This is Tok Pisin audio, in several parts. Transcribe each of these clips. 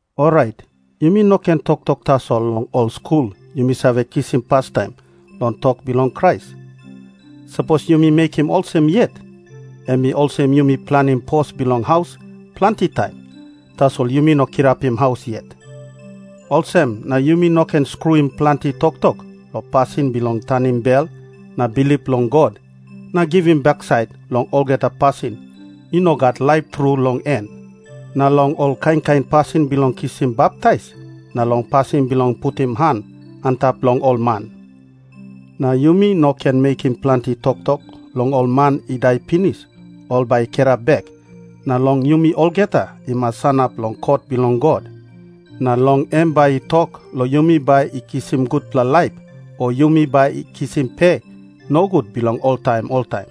Orait yumi no ken toktok tasol long ol skul yumi save kisim pastaim long tok bilong Krais. Sapos yumi mekim olsem yet, em i olsem yumi planim pos bilong haus planti taim, tasol yumi no kirapim haus yet. Olsem na yumi no ken skruim planti toktok long pasin bilong tanim bel na bilip long God na givim baksait long olgeta pasin i no gat laip tru long en, na long ol kain kain pasin bilong kisim baptais na long pasin bilong putim han antap long ol man. Na yumi no ken mekim planti toktok long ol man i dai pinis ol bai i kirap bek, na long yumi olgeta i mas sanap long kot bilong God, na long em bai i tok long yumi bai i kisim gutpela laip o yumi bai i kisim pe nogut bilong oltaim oltaim.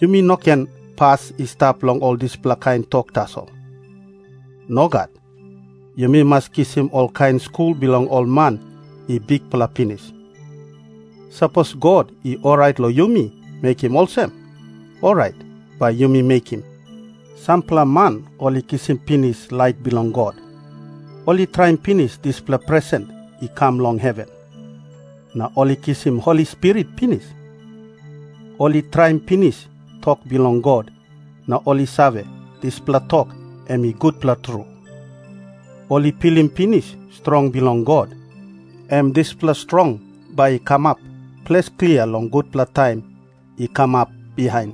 Yumi no ken pas i stap long ol dispela kain tok tasol. Nogat. Yumi mas kisim olkain skul bilong ol man i bikpela pinis. Sapos God i orait long yumi mekim olsem, orait bai yumi mekim. Sampela man ol i kisim pinis lait bilong God. Ol i traim pinis dispela presen i kam long heven. Na ol i kisim Holi Spirit pinis. Ol i traim pinis tok bilong God, na ol i save, dispela tok em i gutpela tru. Ol i pilim pinis strong bilong God, em dispela strong bai i kamap ples klia long gutpela taim i kamap bihain.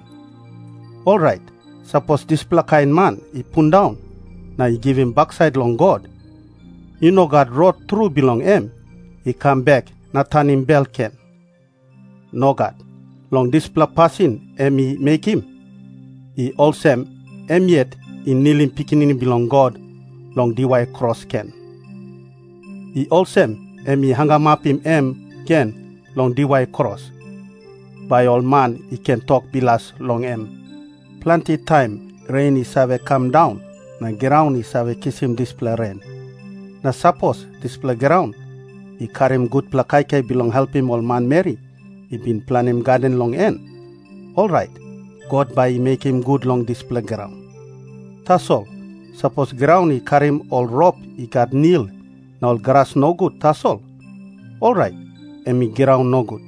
Orait sapos dispela kain man i pundaun na i givim baksait long God, i no gat rot tru bilong em i kam bek na tanim bel gen. Nogat. Long dispela pasin em i mekim, i olsem em yet i nilim Pikinini Bilong God long diwai kros gen. I olsem em i hangamapim em gen long diwai kros, bai ol man i ken tok bilas long em. Planti taim ren i save kam daun, na graun i save kisim dispela ren. Na sapos dispela graun i karim gutpela kaikai bilong helpim ol manmeri i bin planim gaden long en, orait God bai i mekim gut long dispela graun. Tasol sapos graun i karim ol rop i gat nil na ol gras nogut tasol, orait em i graun nogut.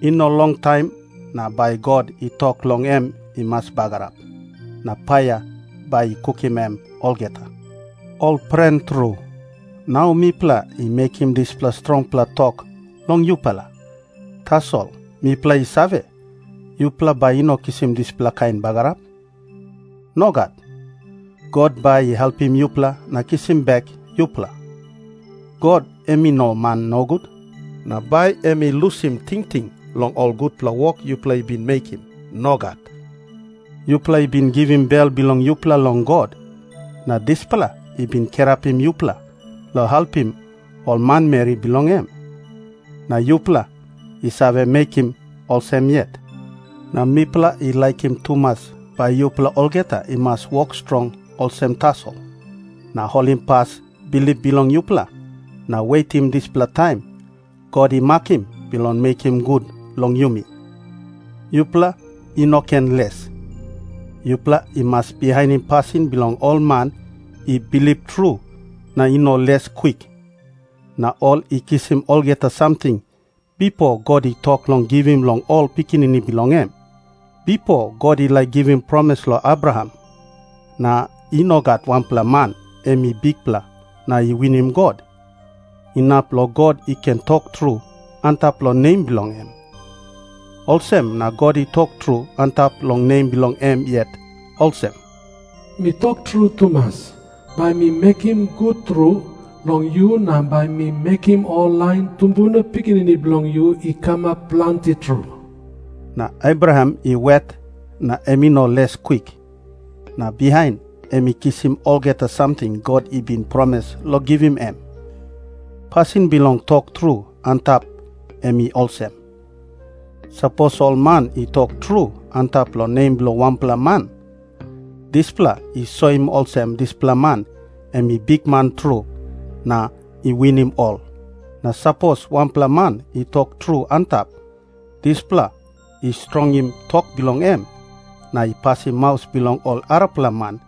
I no longtaim na bai God i tok long em i mas bagarap. Na paia bai i kukim em olgeta. Ol pren tru, nau mipela i mekim dispela strongpela tok long yupela. Tasol mipela i save, yupela bai i no kisim dispela kain bagarap. Nogat. God bai i helpim yupela na kisim bek yupela. God em i no man nogut, na bai em i lusim tingting long ol gutpela wok yupela i bin mekim. Nogat. Yupela i bin givim bel bilong yupela long God, na dispela i bin kirapim yupela long helpim ol manmeri bilong em. Na yupela i save mekim olsem yet. Na mipela i laikim tumas bai yupela olgeta i mas wok strong olsem tasol, na holimpas bilip bilong yupela, na wetim dispela taim God i makim bilong mekim gut long yumi. Yupela i no ken les. Yupela i mas bihainim pasin bilong ol man i bilip tru na i no les kwik, na ol i kisim olgeta samting bipo God i tok long givim long ol pikinini bilong em. Bipo God i laik givim promis long Abraham. Na i no gat wanpela man em i bikpela na i winim God, inap long God i ken tok tru antap long nem bilong em. Olsem na God i tok tru antap long nem bilong em yet olsem, “Mi tok tru tumas, bai mi mekim gut tru long yu na bai mi mekim ol lain tumbuna pikinini bilong yu i kamap planti tru.” Na Abraham i wet na em i no les kwik, na bihain em i kisim olgeta samting God i bin promis long givim em. Pasin bilong tok tru antap em i olsem. Sapos ol man i tok tru antap long nem bilong wanpela man, dispela i soim olsem dispela man em i bikman tru na i winim ol. Na sapos wanpela man i tok tru antap, dispela i strongim tok bilong em na i pasim maus bilong ol arapela man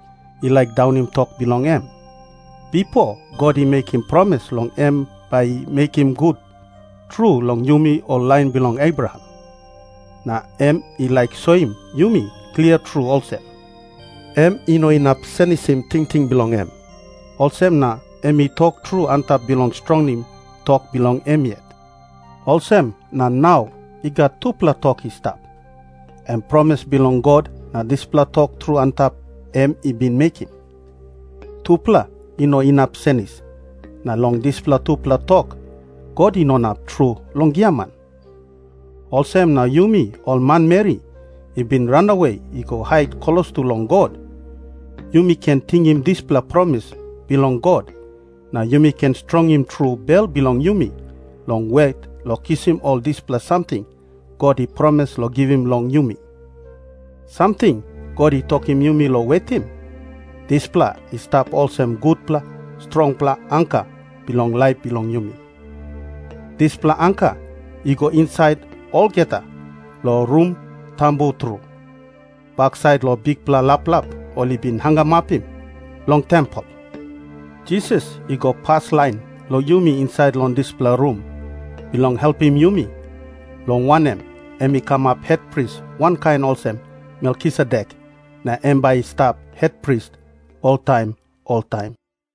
i laik daunim tok bilong em. Bipo God i mekim promis long em bai i mekim gut tru long yumi ol lain bilong Abraham. Na em i laik soim yumi klia tru olsem, em i no inap senisim tingting bilong em, olsem na em i tok tru antap bilong strongim tok bilong em yet. Olsem na nau i gat tupela tok i stap, em promis bilong God na dispela tok tru antap em i bin mekim. Tupela i no inap senis, na long dispela tupela tok God i no inap tru long giaman. Olsem na yumi ol manmeri i bin ranawe i go hait klostu long God, yumi ken tingim dispela promis bilong God na yumi ken strongim tru bel bilong yumi long wet long kisim ol dispela samting God i promis long givim long yumi. Samting God i tokim yumi long wetim, dispela i stap olsem gutpela strongpela anka bilong laip bilong yumi. Dispela anka i go insait olgeta long Rum Tambu Tru, baksait long bikpela laplap ol i bin hangamapim long tempel. Jisas i go paslain long yumi insait long dispela rum, bilong helpim yumi, long wanem, em i kamap hetpris wankain olsem Melkisedek, na em bai i stap hetpris oltaim oltaim.